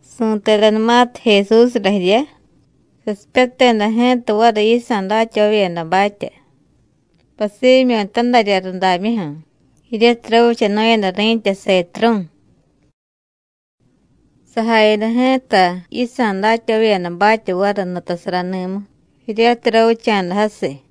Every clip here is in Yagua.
Su̱tedanumatiy Jesúsra jirya, sasipyateda ji̱ta variy yisa̱ datyavavyedabatya, pasimyu̱ tadarya rudamyuju̱, jiryatiy ravichanu̱yada ri̱tya Setrú̱. Sajayada ji̱ta yisa̱ datyavavyedabatya variy nutasarani̱mu, jiryatiy ravicha̱da jasiy.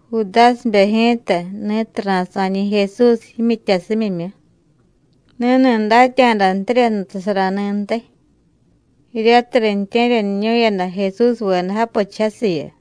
Judásibe ji̱ta ni̱tiy ra̱sa̱ñi̱ Jesús jimyityasimyimyu, ni̱ni̱ datya̱dantirya nutasarani̱ntiy, jiryatiy riintye̱ryaniñu̱yada Jesúsveda japichiy jasiyu.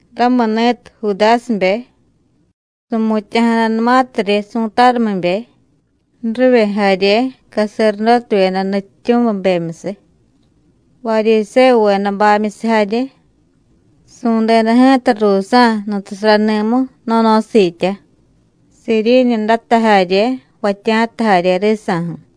Ramuni̱tiy Judásibe, su̱mutya̱jadanumatiryi su̱tarumibe, ju̱rivye jarye caserdótevyeda nutyityu̱mibemyusiy, Varyisévuvedabamyusiy jarye, su̱deda ji̱ta ruusa̱ nutasarani̱mu no̱no̱siitya, siiriiñudata jarye, jvatya̱ta jarye risa̱ju̱.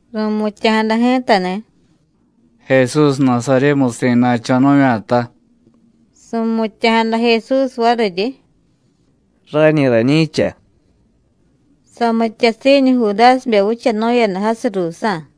Ru̱mutya̱jada ji̱tani̱: “Jesús Nasaryémusi̱ na̱cho̱ nu̱vya̱ta.” Su̱mutya̱jada Jesús variryi: “Rañi rañi̱cha.” Samityasiiñu Judásibe vichanu̱yada jasiy ruusa̱.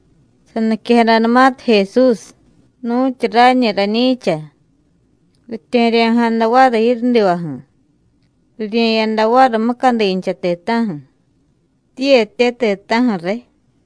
Saniquejadanumatiy Jesús: “Nu̱tyu rañi rañi̱cha,” ritye̱ryo̱jada variy jiryudivaju̱, rirye̱yada variy mucadincha ti̱ta̱ju̱, tiiyetye ti̱ta̱ju̱ riy.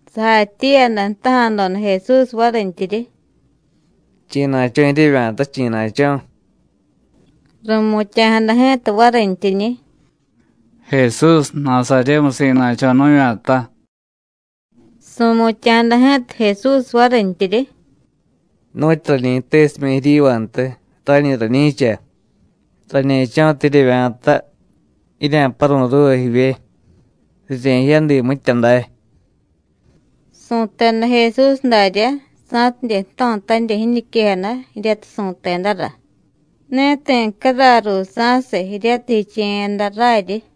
Sajatyiiyada jtaja̱doda Jesús varintyiryi: “¿Chi̱na̱cho̱ jiryevya̱ta, chi̱na̱cho̱?” Ru̱mutya̱jada ji̱ta varintyiñi̱: “Jesús Nasaryémusi̱ na̱cho̱ nu̱vya̱ta.” Su̱mutya̱jada ji̱ta Jesús varintyiryi: “Nu̱tyu rañi jtesimya̱ jiryivantiy, rañi rañi̱cha. Rañe̱cho̱tiy jiryevya̱ta, jirya̱paru̱y ruuva jivye, rirye̱jyádiiy mitya day.” Su̱teda Jesús daryá, sa̱tidye jto̱tanirya jiñiquejada jiryatiy su̱tedara: Ne ti̱ caray ruusa̱siy, jiryatiy jiche̱yada raryi.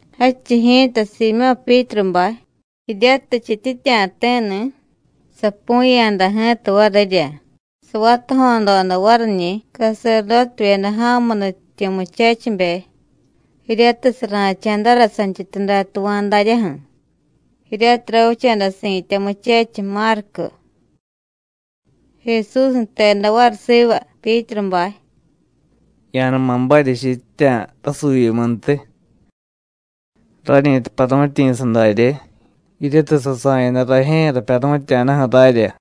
Jadchiy ji̱ta Siimyó̱ Pyítrubay, jiryatiy jchityitya̱ti̱ni̱, sapu̱ya̱da ji̱ta varirya, savatajo̱doda variñi̱ caserdótevyeda ja̱mu nutyityu̱ muchechibe, jiryatiy sara̱cha̱dara santyityuday tuva̱y daryaju̱, jiryatiy ravicha̱da si̱tya muchechiy, Márcu. Jesús jteda variy siva Pyítrubay: “Ya̱numa barya jichityitya̱ rasuuvyimuntiy. ¡Rañi̱ta paru̱tyi̱sa darye, jiryatiy sasa̱yada rajye̱ rapyaru̱tya̱daju̱ rarya!”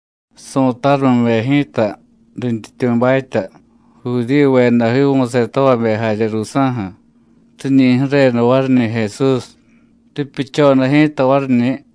Su̱tarumibe ji̱ta, rintyityu̱batya, Judíyuveda jiivu̱setavabe jarye ruusa̱ju̱, riñi ju̱reda variñi̱ Jesús, ripyuchoda ji̱ta variñi̱.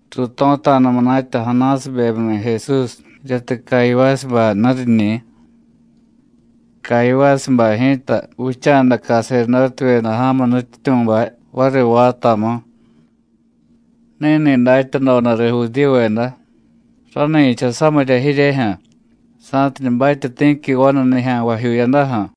Ruuto̱ta̱da munatya Anásibemyuni̱ Jesús, jiryatiy Cayivásubay nuriñi̱. Cayivásubay ji̱ta vicha̱da caserdótevyeda ja̱mu nutyityu̱bay variy vaatamu. Ni̱ni̱ datyadodariy Judíyuveda: Rani̱cha samirya jiryejyu̱ sa̱tidye batye ti̱qui vanu nijya̱nvajyuu jiyadaju̱.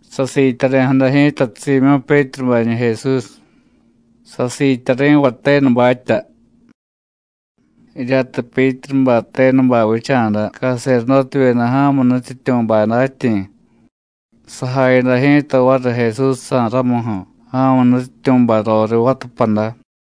Sasiityari̱jada ji̱ta Siimyó̱ Pyítrubañi̱ Jesús, sasiityari̱vay tenubatya. Jiryatiy Pyítrubay tenubay vicha̱da caserdótevyeda ja̱mu nutyityu̱bay datyi̱, sajayada ji̱ta variy Jesúsjsa̱ ramuju̱, ja̱mu nutyityu̱bay roriy vatapada.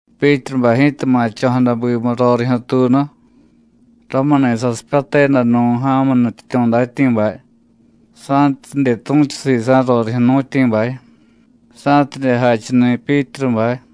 Pyítrubay ji̱ta ma̱cho̱jada bimu rorijyu̱ tuunu. Ramuni̱ sasipyateda nu̱, ja̱mu nutyityu̱ datyi̱bay, sa̱tidye tu̱chu sisa̱ rorijyu̱ jnu̱tyi̱bay, sa̱tidye jachuni̱ Pyítrubay.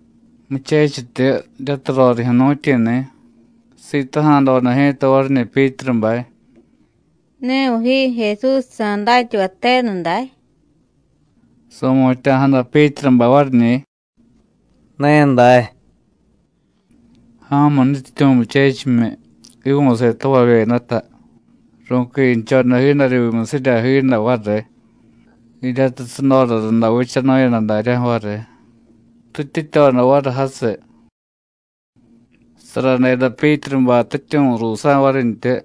Muchechityu jiryatiy rorijyu̱ jnu̱tyi̱ni̱, sitaja̱doda ji̱ta variñi̱ Pyítrubay: “¿Ne viy ji Jesúsjsa̱ datyavay tenu day?” Su̱mutya̱jada Pyítrubay variñi̱: “Ne day.” Ja̱mu nutyityu̱ muchechimyi, jiivu̱setavavyedata, ru̱quinchoda jiidaryuumusirya jiiday variy, jiryatiy sudora runda vichanu̱yada daryaju̱ variy, rityityoda variy jasiy. Saradeda Pyítrubay tityu̱ ruusa̱ varintyi.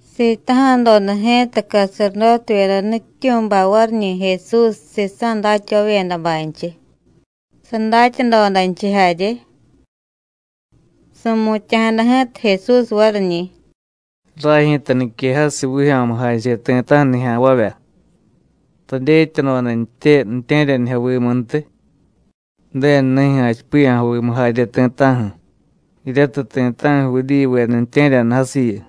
Sitaja̱doda ji̱ta caserdótevyeda nutyityu̱bay variñi̱ Jesús sisa̱ datyavavyedabaynchiy, sadatyadodanchiy jarye. Su̱mutya̱jada ji̱ta Jesús variñi̱: “Ray ji̱ta niquejasiy vijyo̱mujache ti̱ta̱ju̱ nijya̱nvavya. Radyetyadodantye ju̱tye̱ryanijyovimuntiy, Ju̱denu nijyu̱ jachipiya̱jovimu jarye ti̱ta̱ju̱, jiryatiy ti̱ta̱ju̱ Judíyuveda ju̱tye̱ryaniy jasiyu.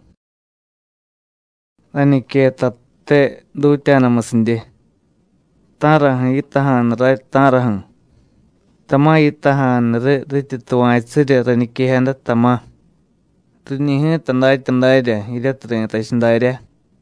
Rañiquettate dutya̱damusidye. ¿Ta̱raju̱ yitaja̱nu ray, ta̱raju̱? ¡Tama̱ yitaja̱nu riy rityi tuva̱chusirya rañiquejada, tama̱! ¡Riñi̱ ji̱ta datya darya, jiryatiy ri̱tachiy daryá!”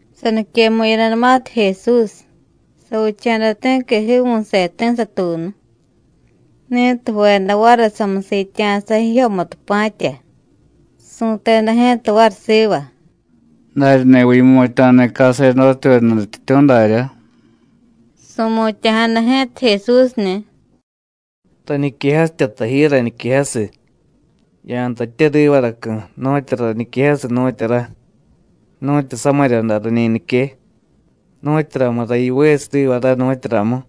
Saniquemu̱yadanumatiy Jesús, savicha̱da ti̱qui jiivu̱seti̱ satuunu, ni̱tiy ju̱veda variy samusiitya̱sa jijyomutu pa̱tya, su̱teda ji̱ta variy siva: “¡Daryani̱viy yimutya̱ni̱ caserdótevyeda nutyityu̱, daryá!” Su̱mutya̱jada ji̱ta Jesúsni̱: “Rañiquejasitya taji, rañiquejasiy. Ya̱jtatye rivaracu̱, nu̱tyura rañiquejasiy, nu̱tyura. Nu̱tyu samirya day rañi nique, ¿nu̱tyuramura yivesiy riva ray, nu̱tyuramu?”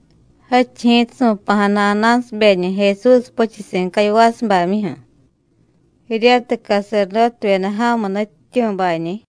Jadchiy ji̱ta su̱pa̱jada Anásibeñi̱ Jesús puchusi̱ Cayivásubamyuju̱, jiryatiy caserdótevyeda ja̱mu nutyityu̱bañi̱.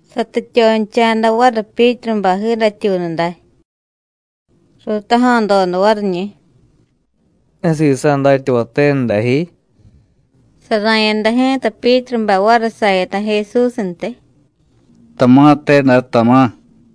Satityoncha̱da variy Pyítrubay jiidatyuunu day. Ruutaja̱doda variñi̱: “¿Ne sisa̱ datyavay tenu dajyi?” Sara̱yada ji̱ta Pyítrubay variy sayada Jesúsntiy: “Tama̱te day, tama̱.”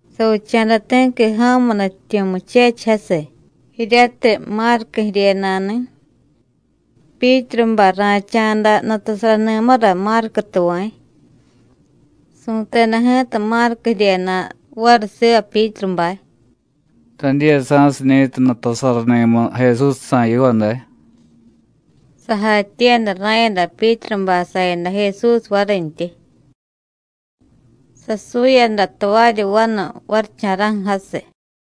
Savicha̱da ti̱qui ja̱mu nutyityu̱ muchechiy jasiy, jiryatiy Márcu jiryena̱ni̱. Pyítrubay ra̱cha̱da nutasarani̱mura Márcu tuva̱y. Su̱teda ji̱ta Márcu jiryena̱ variy siva Pyítrubay: “¿Radiyasa̱siñi̱tiy nutasarani̱mu Jesúsjsa̱ yiva day?” Sajatyiiyada ra̱yada Pyítrubay sayada Jesús varintyi. Sasuyada tavaryi vanu varicha̱ra̱ju̱ jasiy.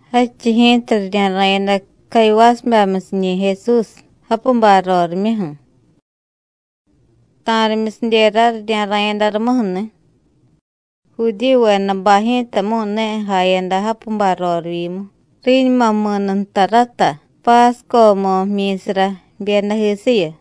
Jadchiy ji̱ta rirya̱ra̱yada Cayivásubamyusiñi̱ Jesús, japubay rorimyuju̱. Ta̱rimyusidyera rirya̱ra̱yada rumuju̱ni̱. Judíyuvedabay ji̱tamu̱y ne jayada japubay rorivyimu, riñuma mi̱nu nta rata páscomu jmyi̱sara jbyedajisiyu.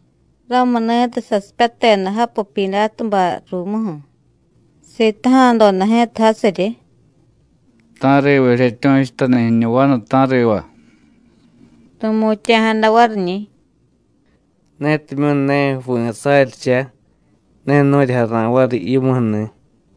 Ramuni̱tiy sasipyateda japu Pyidátubay ruumuju̱, sitaja̱doda ji̱ta jasiryi: “¿Ta̱riva jiryetyu̱chutani̱ jiñu vanu, ta̱riva?” Ru̱mutya̱jada variñi̱: “Netimyu̱ ne jvi̱ saryicha, ne nu̱ryi jara̱y variy yimuju̱ni̱.”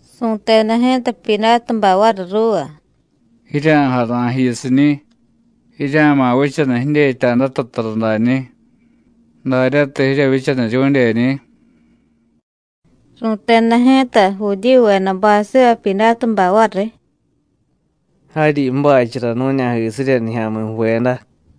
Su̱teda ji̱ta Pyidátubay variy ruuva: “Jirya̱jara̱y jiyusiñi̱, jirya̱ma̱ vichaniy jidyetya̱data tara dañi̱, daryatiy jiryevyichaniryu̱dyeñi̱.” Ru̱teda ji̱ta Judíyuvedabay siva Pyidátubay variy: “Jaryi ju̱bachara nu̱ña̱jisirya nijya̱mi̱ ju̱veda.”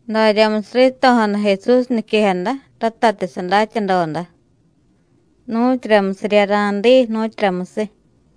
Daryamusiy rito̱jada Jesús niquejada, ratatiy sadatyadoda: Nu̱tyuramusirya ra̱diiy, nu̱tyuramusiy.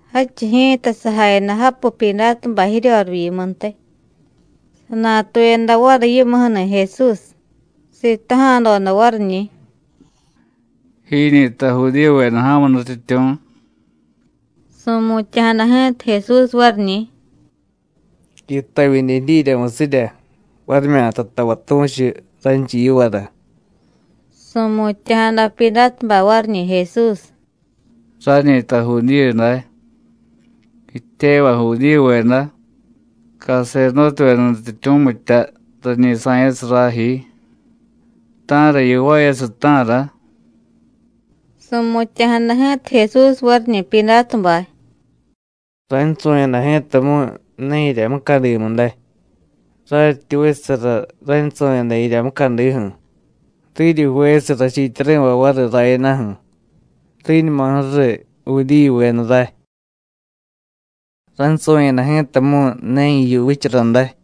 Jadchiy ji̱ta sajayada japu Pyidátubay jiryorivyimuntiy. Sanatuyada variy yimuju̱ni̱ Jesús, sitaja̱doda variñi̱: “¿Jiñi̱ta Judíyuveda ja̱mu nutyityu̱?” Su̱mutya̱jada ji̱ta Jesús variñi̱: “¿Yitavyidye jidyiryamusirya, varimyata tavay tu̱chu raynchiy yivara?” Su̱mutya̱jada Pyidátubay variñi̱ Jesús: “Rañi̱ta Judíyu day. Jityevay Judíyuveda, caserdótevyeda nutyityu̱mitya rañi sa̱yasiy ray ji. ¿Ta̱ra yivaayasiy, ta̱ra?” Su̱mutya̱jada ji̱ta Jesús variñi̱ Pyidátubay: “Raynsu̱yada ji̱tamu̱y ne jirya mucadimu day. Raryityi vichasara raynsu̱yada jirya mucadiju̱, riryi jvesiy rachiityari̱vay variy rayadaju̱, riñuma ju̱riy Judíyuveda ray. Raynsu̱yada ji̱tamu̱y ne jiyu vichara day.”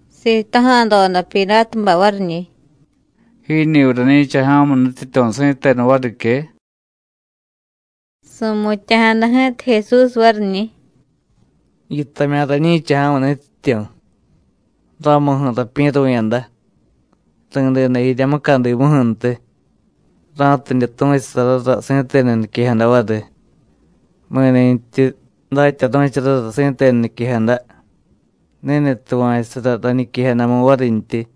Sitaja̱doda Pyidátubay variñi̱: “¿Jiñi̱viy rañi̱cha ja̱mu nutyityu̱ si̱tenu varique?” Su̱mutya̱jada ji̱ta Jesús variñi̱: “Yitamya̱ rañi̱cha ja̱mu nutyityu̱. Ramuju̱ rapyi̱ru̱yada, ri̱deda jirya mucadimuju̱ntiy, ra̱tidye tu̱chusarara si̱tenu niquejada variy. Mi̱ni̱tyi datyaru̱charara si̱tenu niquejada, ni̱ni̱ tuva̱chusara rañiquejadamu varintyi.”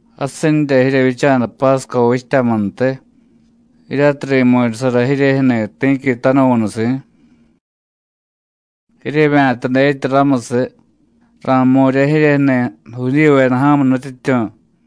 Jasinrya jiryevyicha̱da pásco vichtyamuntiy, jiryatiy ri̱mu̱ryasara jiryejyu̱ni̱ ti̱qui tanuvu̱nusi̱. ¿Jiryevya̱ta dyetya ramusiy ra̱jmu̱rya jiryejyu̱ni̱ Judíyuveda ja̱mu nutyityu̱?”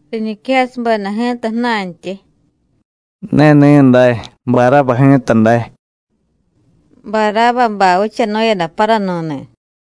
Riñiquejasubeda ji̱ta ju̱na̱ntyi: “Ne ní̱dáy. Barába ji̱ta day.” Barábabay vichanu̱yada paranu̱ni̱.